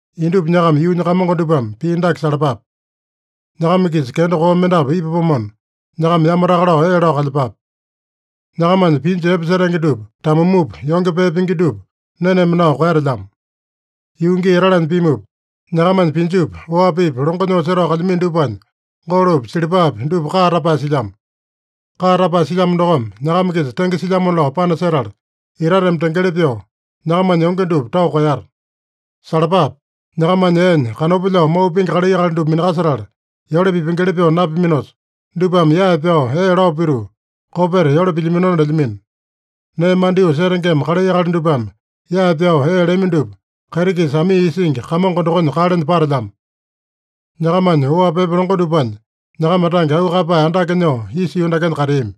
Indupa nyakama yuunya kamongo dupame pii dake salapape: Nyakama-kisa kenda koo mendapu ipapomona, nyakama yamataka lao ee lao kalyepape. Nyakamanya pinju epe setenge dupa tamumupa, yonge pee pingi dupa neneme nao koeyatelyamo. Yuu gii etalanya pimupa, nyakamanya pinjupi, oapipi, longo nyoo setao kalyamino dupanya golopi, silipapi dupa kaa tapae silyamo. Kaa tapae silyamo dokome, nyakama-kisa tenge silyamona lao panasetala, itateme tengeli pyoo, nyakamanya yonge dupa tao koeyata. Salapape! Nyakamanya eenya kanopa lyao mau pingi kalai akali dupa minakasetala, yole pipengeli pyoo napiminosa, dupame yae pyao ee lao pituu, kopeta yole pilyaminona lelyamino. Nee mandyoo setengema kalai akali dupame yae pyao ee lami dupa Kaiti-Kisa Amii Isingi Kamongo dokonya kalenya patelyamo. Nyakamanya oapi epe longo dupanya nyakama tange auu kaeyapae andake nyoo isa yuu dakenya kateami.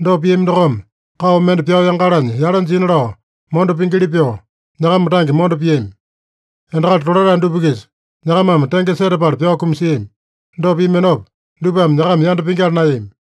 Dopa piami dokome kao mende pyao yangalanya yale jina lao mondo pingili pyoo, nyakama tange mondo piami. Endakali tolatae dupa-kisa nyakamame tenge setapala pyao kumasiami. Dopa piaminopa, dupame nyakama yanda pingyala naeyami.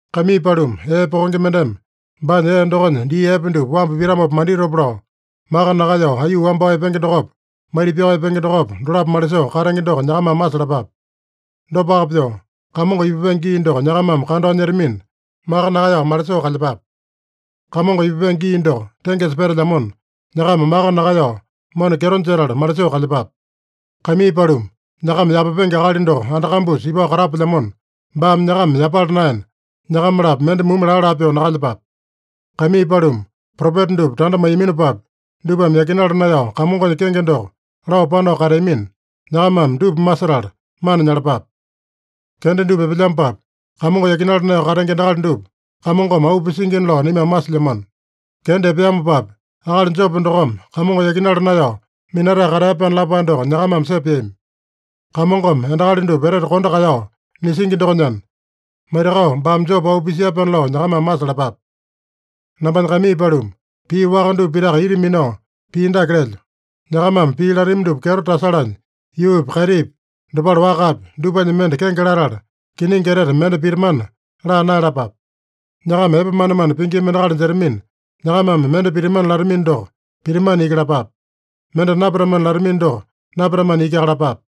Kaimii paluma, ee pokenge mendeme baanya ee dokonya dii epe dupa wambu pitamopa manditopa lao, maka nakaeyao aiyuu wambao epenge dokopa, maita-pyao epenge dokopa, dolapo malisoo katenge doko nyakamame masalapape. Dopaka pyoo, Kamongo ipupenge gii doko nyakamame kandao nyetamina, maka nakaeyao malisoo kalyepape. Kamongo ipupenge gii doko tengesa petelyamona, nyakama maka nakaeyao, mona kyeto jetala malisoo kalyepape. Kaimii paluma, nyakama yapapenge akali doko anda kambusa ipao katapelyamona, baame nyakama yapala naena, nyakama-lapo mende mumu laa-laa pyoo nakalyepape. Kaimii paluma, propeta dupa tanda maiyaminopapi, dupame yakinala naeyao Kamongonya kenge doko lao panao kateamina, nyakamame dupa masetala mana nyalapape. Kenda dupa epelyamopapi, Kamongo yakinala naeyao katenge endakali dupa Kamongome auu pisingina lao naimame masilyamano. Kenda epeamopapi, akali Jopo dokome Kamongo yakinala naeyao minatae katea-pyaana lapae doko nyakamame sepeami. Kamongome endakali dupa etete kondo kaeyao nisingi dokonyana, maitakao baame Jopo auu pisia-pyaana lao nyakamame masalapape. Nambanya kaimii paluma, pii waka dupa pitaka ita minao pii dake lelyo: Nyakamame pii latami dupa kyeto tasalanya, yuupi, kaitipi, dopale wakapi, dupanya mende kenge latala, kiningi etete mende pitamana laa naeyalapape. Nyakama epe manemane pingima endakali jetamina, nyakamame mende pitamana latamino doko, pitamana iki lapape. Mende napitamana latamino doko, napitamana ikiaka lapape.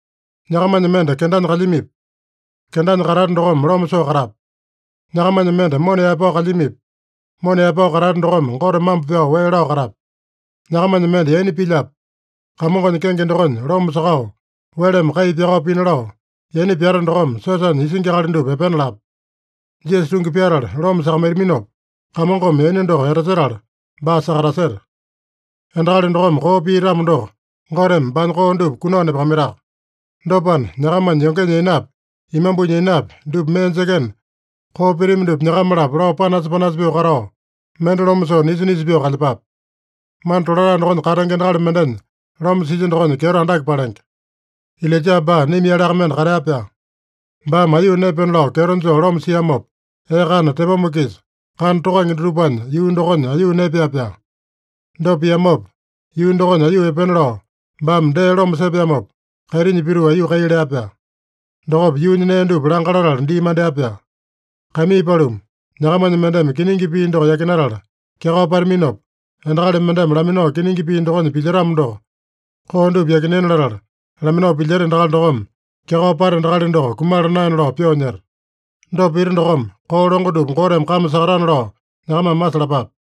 Nyakamanya mende kendanya kalyamipi? Kendanya katate dokome loma soo katape. Nyakamanya mende mona yaepao kalyamipi? Mona yaepao katate dokome Gote mambo pyao wee lao katape. Nyakamanya mende yaina pilyape? Kamongonya kenge dokonya loma sakao, weleme kai pyakao pina lao, yaina pyata dokome siosanya isingi akali dupa epena lape. Jisasa tungi pyatala loma sakamaitaminopa, Kamongome yaina doko etasetala baa sakataseta. Endakali dokome koo pia-tamo doko, Goteme baanya koo dupa kunao nepakamaitaka. Dopana, nyakamanya yongenya yainapi, imambunya yainapi, dupa mee jekena, koo pitami dupa nyakama-lapo lao panasa-panasa pyoo katao, mende loma soo nisa-nisa pyoo kalyepape. Mana tolatae dokonya katenge endakali mendenya loma silya dokonya kyeto andake palenge. Ilaija baa naima-yaleaka mende katea-pyaa. Baame aiyuu naepena lao kyeto joo loma siamopa, ee kana tepoma-kisa kana tokange dutupanya yuu dokonya aiyuu naepea-pyaa. Dopa piamopa, yuu dokonya aiyuu epena lao baame dee loma sepeamopa, kaitinya pituu aiyuu kai lea-pyaa. Dokopa yuunya nee dupa langa latala dii mandea-pyaa. Kaimii paluma, nyakamanya mendeme kiningi pii doko yakinatala kyakao pataminopa, endakali mendeme laminao kiningi pii dokonya pilyetamo doko, koo dupa yakinena latala laminao pilyeta endakali dokome, kyakao pata endakali doko kumala naena lao pyoo nyeta. Dopa pita dokome, koo longo dupa Goteme kame sakatana lao nyakamame masalapape.